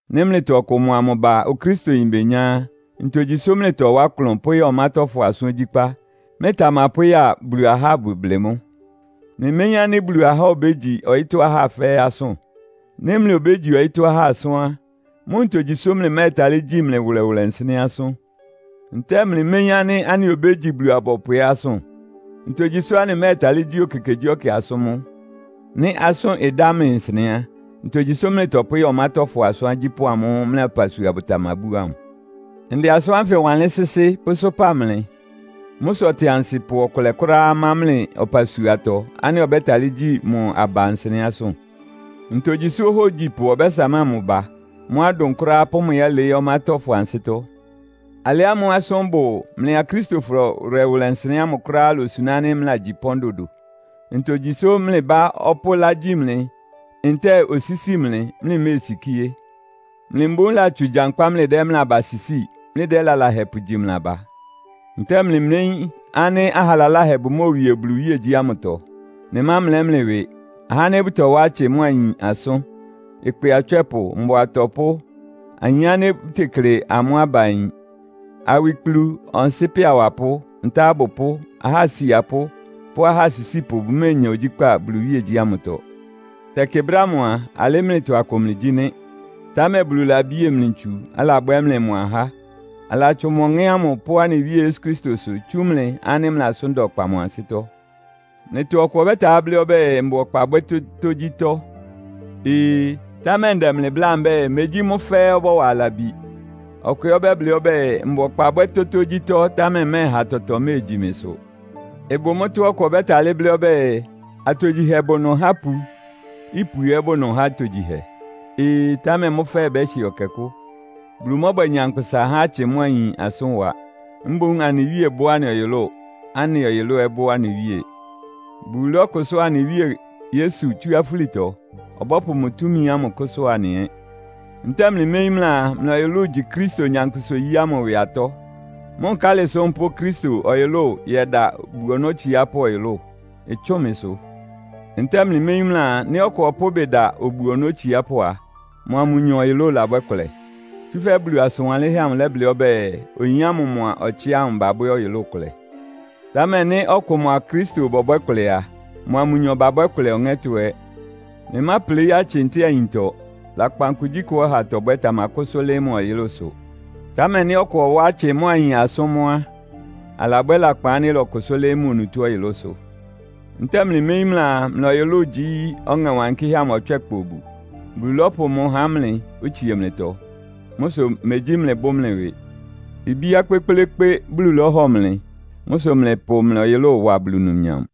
Nɩ́ mlɩtɔ ɔkʋ mʋa mʋ ba Okristoyin benyá á, ntogyi sʋ́ mlɩtɔwá klʋn pʋ́ya ɔmátɔ́fɔ asʋ́n ogyíkpá, mlɩtamapʋ́ ya Bulu ahá abʋblɩ mʋ́? Mlɩméyín ánɩ́ Bulu ahá obégyi ɔyɩ́tɔ́ ahá fɛ́ɛ́ asʋ́n? Nɩ́ mlɩ obégyi ɔyɩ́tɔ́ ahá asʋ́n á, mʋ́ ntogyi sʋ́ mlɩmɛ́ɛtalɩ́ gyi mlɩ wʋlɛwʋlɛ nsɩnɛ́ asʋ́n? Ntɛ́ɛ mlɩméyín ánɩ́ anɩ obégyi Bulu-abɔpʋ ɛ́ asʋ́n? Ntogyi sʋ́ anɩmɛ́ɛtalɩ́ gyi ekekegyíɛkɛ asʋ́n mʋ́? Nɩ́ asʋ́n ɩdá mlɩ nsɩnɛ́ á, ntogyi sʋ́ mlɩtɔpʋ́ya ɔmátɔ́fɔ asʋ́n agyípʋ́ amʋ́ʋ́ mlɩ ɔpasuafɔ bʋtamabú ámʋ? Ndɛ asʋ́n ánfɩ wanlɩ́n sɩ́sɩ́ pʋ́sʋ́pa mlɩ. Mʋ́ sʋ ɔtɩansɩpʋ ɔkʋlɛ kʋ́ráá má mlɩ ɔpasuatɔ ánɩ́ ɔbɛ́talɩ́ gyi mʋ aba nsɩnɛ́ asʋ́n? Ntogyi sʋ́ ohógyipʋ ɔbɛ́samáa mʋ ba, mʋ́a ɩdʋn kʋ́ráá pʋ́ mʋ yɛ́lɩɩ́ ɔmátɔ́fɔ ansɩ́tɔ́? Alɩ ámʋ́ʋ́ asʋ́n ɩbʋ mlɩ Akristofɔ wʋlɛwʋlɛ nsɩnɛ́ ámʋ kʋ́ráá ilosuná ánɩ́ mlɩlagyi pɔ́n dodo. Ntogyi sʋ́ mlɩ bá ɔpʋ́ ɩlá gyí mlɩ, ntɛ́ɛ osísi mlɩ, mlɩméesikíé? Mlɩ mboún latsʋn gyankpá mlɩdɛ́ mlɩ aba sisíi, mlɩdɛ́ lalahɛ pʋgyi mlɩ aba? Ntɛ́ɛ mlɩméyín ánɩ́ aha laláhɛ bʋmóowie Bulu iwíegyí ámʋtɔ? Mlɩmámlɛ́ mlɩ ɩwɩ. Ahá ánɩ́ bʋtɔwá atsɩ mʋ́a ayin asʋ́n, ɩkpɩ atswɛ́pʋ, mbʋa atɔpʋ́, ayin ánɩ́ bʋtekle amʋ́ aba ayin, awikplu, ɔnsɩ́pɛ awapʋ́, ntá abʋpʋ́, ahá asiapʋ́ pʋ́ ahá asisípʋ bʋméenya ogyíkpá Bulu iwíegyí ámʋtɔ. Tɛkɩ brɛ́ ámʋ a, alɩ́ mlɩtɔ akʋ mlɩgyí nɩ́. Támɛ Bulu labie mlɩ ntsu, alabwɛ́ mlɩ mʋ ahá. Alatsʋn mʋ Ɔŋɛ́ ámʋ pʋ́ anɩ Wíe Yesu Kristosʋ tsú mlɩ ánɩ́ mlɩ asʋ́n da ɔkpa mʋ ansɩ́tɔ́. Mlɩtɔ ɔkʋ ɔbɛ́talɩ́ blɩ́ ɔbɛ́ɛ, “Mbʋ ɔkpa bwɛ́ tótógyítɔ́.” Ee! Támɛ ndɛ mlɩ bláa mbɛ́ɛ, “Megyí mʋ́ fɛ́ɛ́ ɔbɔ́wa labi.” Ɔkʋ ɛ́ ɔbɛ́blɩ́ ɔbɛ́ɛ, “Mbʋ ɔkpa bwɛ́ tótógyítɔ́, támɛ mmɛ́ɛha tɔtɔ méegyi mɩsʋ.” Ɩbʋ mʋ́tɔ́á ɔkʋ ɔbɛ́talɩ́ blɩ́ ɔbɛ́ɛ, “Atogyihɛ bʋ ɩnʋ há ipu, ipu ɛ́ bʋ ɩnʋ há atogyihɛ.” Ee! Támɛ mʋ́ fɛ́ɛ́ ɩbɛ́hɩ ɛkɛkʋ́. Bulu mɔ́bwɛ nyankpʋsa há atsɩ mʋ́a ayin asʋ́n wa. Mboún anɩ Wíe bʋ́ anɩ ɔyʋlʋ́ʋ, anɩ ɔyʋlʋ́ʋ ɛ́ bʋ́ anɩ Wíe. Bulu lɔ́kʋsʋ́a anɩ Wíe Yesu tsú afúlitɔ. Ɔbɔ́pʋ mʋ túmi ámʋ kʋ́sʋ́a anɩ ɛ́. Ntɛ́ɛ mlɩméyín mlɩaa, mlɩ ɔyʋlʋ́ʋ igyi Kristo nyankpʋsa-oyí ámʋ ɩwɩ atɔ́? Mʋ́ nkálɩ sʋ́ mpʋ́ʋ Kristo ɔyʋlʋ́ʋ yɛda obu-ɔnɔ́ otsiápʋ́ ɔyʋlʋ́ʋ? Ɩtsʋ́ʋn mɩsʋ! Ntɛ́ɛ mlɩméyín mlɩaa, nɩ́ ɔkʋ ɔpʋ́ ɩbɩ da obu-ɔnɔ́ otsiápʋ́ a, mʋa mʋnyɔ ɔyʋlʋ́ʋ labwɛ́ kʋlɛ? Tsúfɛ́ Bulu asʋn wanlɩ́nhɛ́ amʋ lɛ́blɩ́ ɔbɛ́ɛ, “Oyin ámʋ mʋa ɔtsɩ ámʋ babwɛ́ ɔyʋlʋ́ʋ kʋlɛ.” Támɛ nɩ́ ɔkʋ mʋa Kristo bɔbwɛ́ kʋlɛ a, mʋa mʋnyɔ babwɛ́ ɩkʋlɛ ɔŋɛ́tɔ́ ɛ́. Mlɩmápleí atsɩ ntɛ́ɛ ayintɔ. Lakpan kugyíkʋá ɔha tɔbwɛ́ tamakʋ́sʋ́ lɩ́ɩ́ mʋ ɔyʋlʋ́sʋ. Támɛ nɩ́ ɔkʋ ɔwá atsɩ mʋ́a ayin asʋ́n mʋ́ á, alabwɛ́ lakpan ánɩ́ ɩlɔkʋsʋ́ lɩ́ɩ́ mʋ onutó ɔyʋlʋ́sʋ. Ntɛ́ɛ mlɩméyín mlɩaa, mlɩ ɔyʋlʋ́ʋ gyí Ɔŋɛ Wankɩ́hɛ́ amʋ ɔtswɛ́kpa obu? Bulu lɔ́pʋ mʋ há mlɩ, otsie mlɩtɔ. Mʋ́ sʋ megyí mlɩbʋ́ mlɩ ɩwɩ. Ibíá kpékplékpé Bulu lɔ́hɔ mlɩ. Mʋ́ sʋ mlɩpʋ mlɩ ɔyʋlʋ́ʋ wa Bulu numnyam.